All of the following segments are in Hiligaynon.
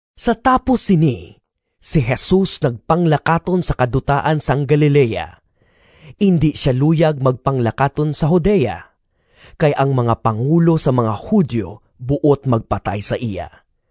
Sa tapos sini, si Jesus nagpanglakaton sa kadutaan sang Galilea. Indi sia luyag magpanglakaton sa Judea, kay ang mga pangulo sang mga Judio buot magpatay sa iya.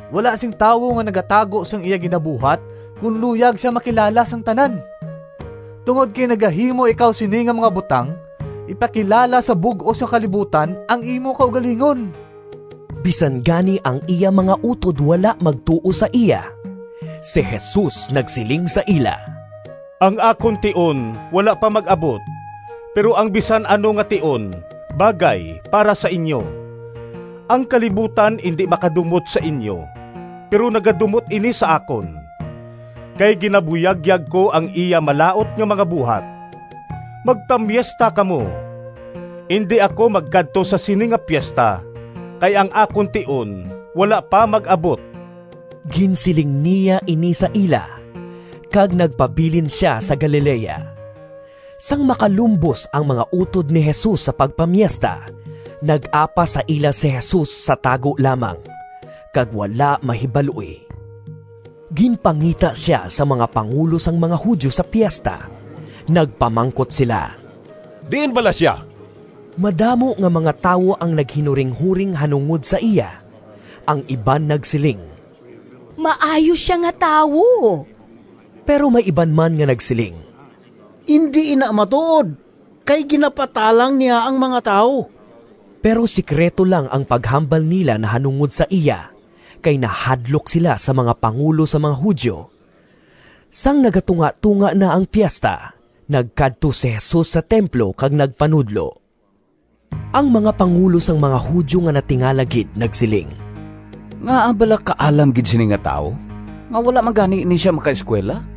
Wala sing tawo nga nagatago sang iya ginabuhat kon luyag sia makilala sang tanan. Tungod kay nagahimo ikaw sini nga mga butang, ipakilala sa bug-os nga kalibutan ang imo kaugalingon!” (Bisan gani ang iya mga utod wala magtuo sa iya.) Si Jesus nagsiling sa ila, “Ang akon tion wala pa mag-abot, pero ang bisan ano nga tion bagay para sa inyo. Ang kalibutan indi makadumot sa inyo, pero nagadumot ini sa akon, kay ginabuyagyag ko ang iya malaut nga mga buhat. Magpamiesta kamo. Indi ako magkadto sa sini nga piesta, kay ang akon tion wala pa mag-abot.” Ginsiling niya ini sa ila, kag nagpabilin sia sa Galilea. Sang makalumbos ang mga utod ni Jesus sa pagpamiesta, nag-apas sa ila si Jesus sa tago lamang, kag wala mahibaloi. Ginpangita sia sang mga pangulo sang mga Judio sa piesta. Nagpamangkot sila, “Diin bala sia?” Madamo nga mga tawo ang naghinuringhoring nahanungod sa iya. Ang iban nagsiling, “Maayo sia nga tawo.” Pero may iban man nga nagsiling, “Indi ina matuod, kay ginapatalang niya ang mga tawo.” Pero sekrito lang ang paghambal nila nahanungod sa iya, kay nahadlok sila sa mga pangulo sang mga Judio. Sang nagatungatonga na ang piesta, nagkadto si Jesus sa templo kag nagpanudlo. Ang mga pangulo sang mga Judio nga natingala gid nagsiling, “Ngaa bala kaalam gid sini nga tawo nga wala man gani ini sia makaeskuwela?”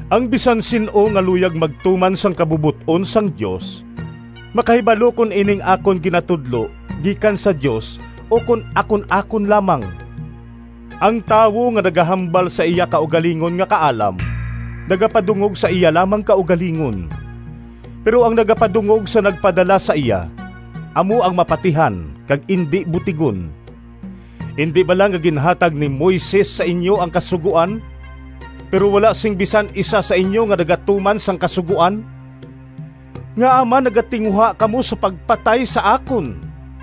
Ang bisan sin-o nga luyag magtuman sang kabubot-on sang Dios makahibalo kon ining akon ginatudlo gikan sa Dios ukon akon-akon lamang. Ang tawo nga nagahambal sa iya kaugalingon nga kaalam nagapadungog sa iya lamang kaugalingon. Pero ang nagapadungog sa nagpadala sa iya, amo ang mapatihan kag indi butigon. Indi bala nga ginhatag ni Moises sa inyo ang Kasugoan? Pero wala sing bisan isa sa inyo nga nagatuman sang Kasugoan. Ngaa man nagatinguha kamo sa pagpatay sa akon?”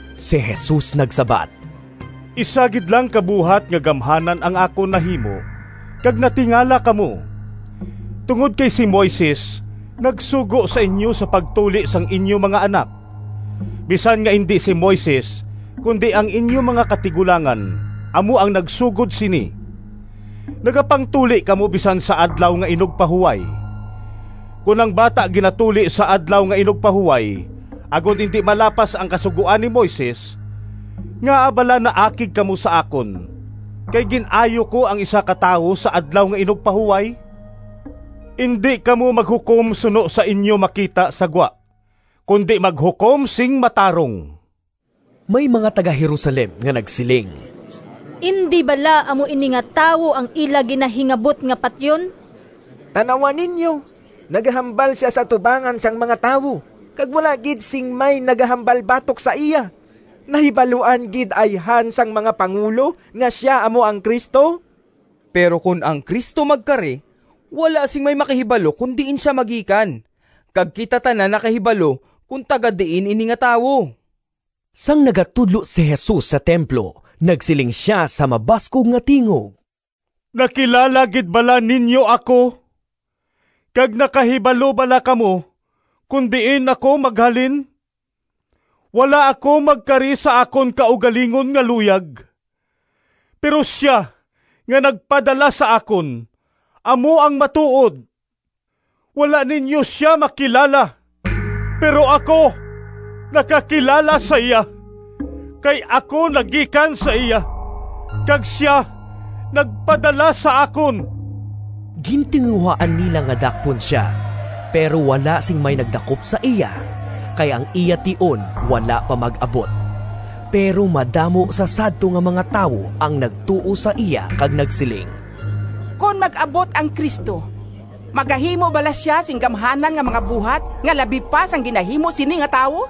Si Jesus nagsabat, “Isa gid lang ka buhat nga gamhanan ang akon nahimo kag natingala kamo. Tungod kay si Moises nagsugo sa inyo sa pagtuli sang inyo mga anak (bisan nga indi si Moises, kundi ang inyo mga katigulangan amo ang nagsugod sini), nagapangtuli kamo bisan sa Adlaw nga Inugpahuway. Kon ang bata ginatuli sa Adlaw nga Inugpahuway agod indi malapas ang Kasugoan ni Moises, ngaa bala naakig kamo sa akon kay gin-ayo ko ang isa ka tawo sa Adlaw nga Inugpahuway? Indi kamo maghukom suno sa inyo makita sa gwa, kundi maghukom sing matarong.” May mga taga-Jerusalem nga nagsiling, “Indi bala amo ini nga tawo ang ila ginahingabot nga patyon? Tan-awa ninyo, nagahambal sia sa atubangan sang mga tawo, kag wala gid sing may nagahambal batok sa iya! Nahibaluan gid ayhan sang mga pangulo nga sia amo ang Cristo? Pero kon ang Cristo magkari wala sing may makahibalo kon diin sia magikan. Kag kita tanan nakahibalo kon taga-diin ini nga tawo.” Sang nagatudlo si Jesus sa templo nagsiling sia sa mabaskog nga tingog, “Nakilala gid bala ninyo ako, kag nakahibalo bala kamo kon diin ako maghalin? Wala ako magkari sa akon kaugalingon nga luyag. Pero sia nga nagpadala sa akon amo ang matuod. Wala ninyo sia makilala, pero ako nakakilala sa iya, kay ako nagikan sa iya, kag sia nagpadala sa akon.” Gintinguhaan nila nga dakpon sia, pero wala sing may nagdakop sa iya, kay ang iya tion wala pa mag-abot. Pero madamo sa sadto nga mga tawo ang nagtuo sa iya kag nagsiling, “Kon mag-abot ang Cristo, magahimo bala sia sing gamhanan nga mga buhat nga labi pa sang ginahimo sini nga tawo?”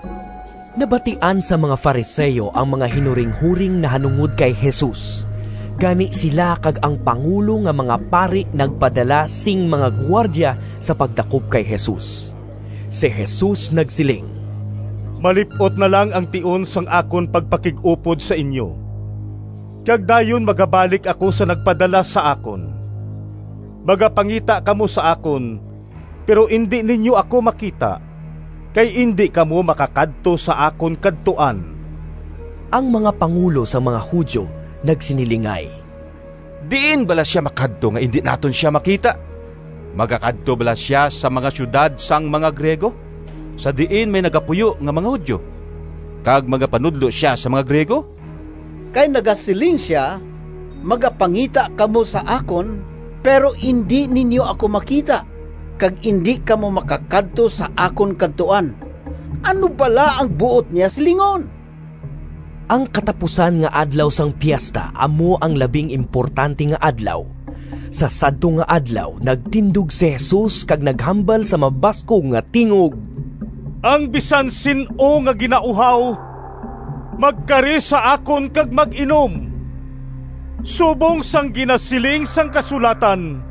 Nabatian sang mga Fariseo ang mga hinuringhoring nahanungod kay Jesus, gani sila kag ang pangulo nga mga pari nagpadala sing mga gwardya sa pagdakop kay Jesus. Si Jesus nagsiling, “Malip-ot na lang ang tion sang akon pagpakig-upod sa inyo, kag dayon magabalik ako sa nagpadala sa akon. Magapangita kamo sa akon, pero indi ninyo ako makita, kay indi kamo makakadto sa akon kadtuan.” Ang mga pangulo sang mga Judio nagsinilingay, “Diin bala sia makadto nga indi naton sia makita? Magakadto bala sia sa mga siyudad sang mga Griego sa diin may nagapuyo nga mga Judio, kag magapanudlo sia sa mga Griego? Kay nagasiling sia, ‘Magapangita kamo sa akon, pero indi ninyo ako makita,’ kag ‘Indi kamo makakadto sa akon kadtuan.’ Ano bala ang buot niya silingon?” Ang katapusan nga adlaw sang piesta amo ang labing importante nga adlaw. Sa sadto nga adlaw nagtindog si Jesus kag naghambal sa mabaskog nga tingog, “Ang bisan sin-o nga ginauhaw magkari sa akon kag mag-inom. Subong sang ginasiling sang kasulatan,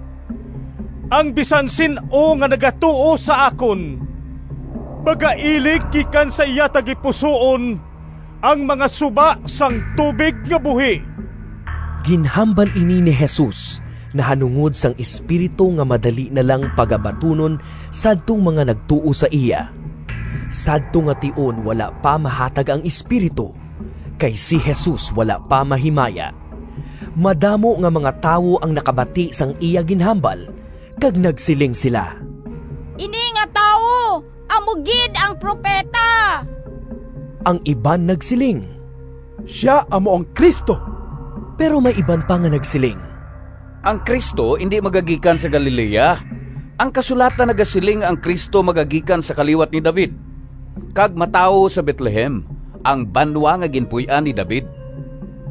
‘Ang bisan sin-o nga nagatuo sa akon, magailig gikan sa iya tagipusoon ang mga suba sang tubig nga buhi.’” (Ginhambal ini ni Jesus nahanungod sang Espiritu nga madali na lang pagabatunon sadtong mga nagtuo sa iya. Sadto nga tion wala pa mahatag ang Espiritu, kay si Jesus wala pa mahimaya.) Madamo nga mga tawo ang nakabati sang iya ginhambal kag nagsiling sila, “Ini nga tawo amo gid ang Propeta!” Ang iban nagsiling, “Sia amo ang Cristo!” Pero may iban pa nga nagsiling, “Ang Cristo indi magagikan sa Galilea! Ang kasulatan nagasiling nga ang Cristo magagikan sa kaliwat ni David, kag matawo sa Betlehem, ang banwa nga ginpuy-an ni David.”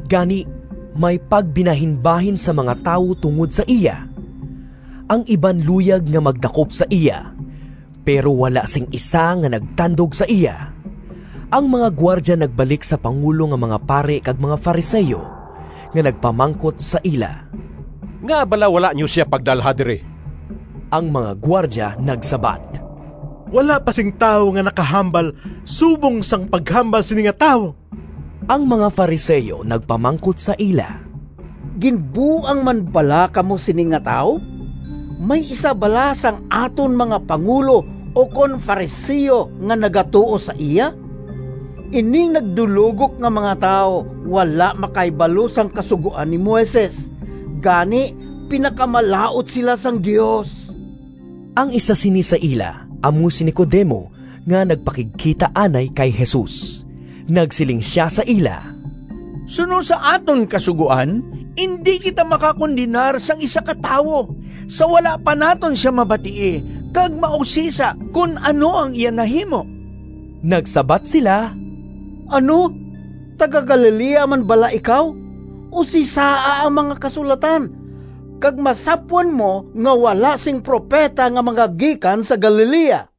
Gani may pagbinahinbahin sa mga tawo tungod sa iya. Ang iban luyag nga magdakop sa iya, pero wala sing isa nga nagtandog sa iya. Ang mga gwardya nagbalik sa pangulo nga mga pari kag mga Fariseo nga nagpamangkot sa ila, “Ngaa bala wala ninyo sia pagdalha diri?” Ang mga gwardya nagsabat, “Wala pa sing tawo nga nakahambal subong sang paghambal sini nga tawo!” Ang mga Fariseo nagpamangkot sa ila, “Ginbuang man bala kamo sini nga tawo? May isa bala sang aton mga pangulo ukon Fariseo nga nagatuo sa iya? Ining nagdulogok nga mga tawo wala makahibalo sang Kasugoan ni Moises, gani pinakamalaut sila sang Dios!” Ang isa sini sa ila amo si Nicodemo nga nagpakigkita anay kay Jesus. Nagsiling sia sa ila, “Suno sa aton Kasugoan indi kita makakondenar sang isa ka tawo sa wala pa naton sia mabatii kag mausisa kon ano ang iya nahimo.” Nagsabat sila, “Ano, taga-Galilea man bala ikaw? Usisaa ang mga Kasulatan kag masapwan mo nga wala sing propeta nga magagikan sa Galilea.”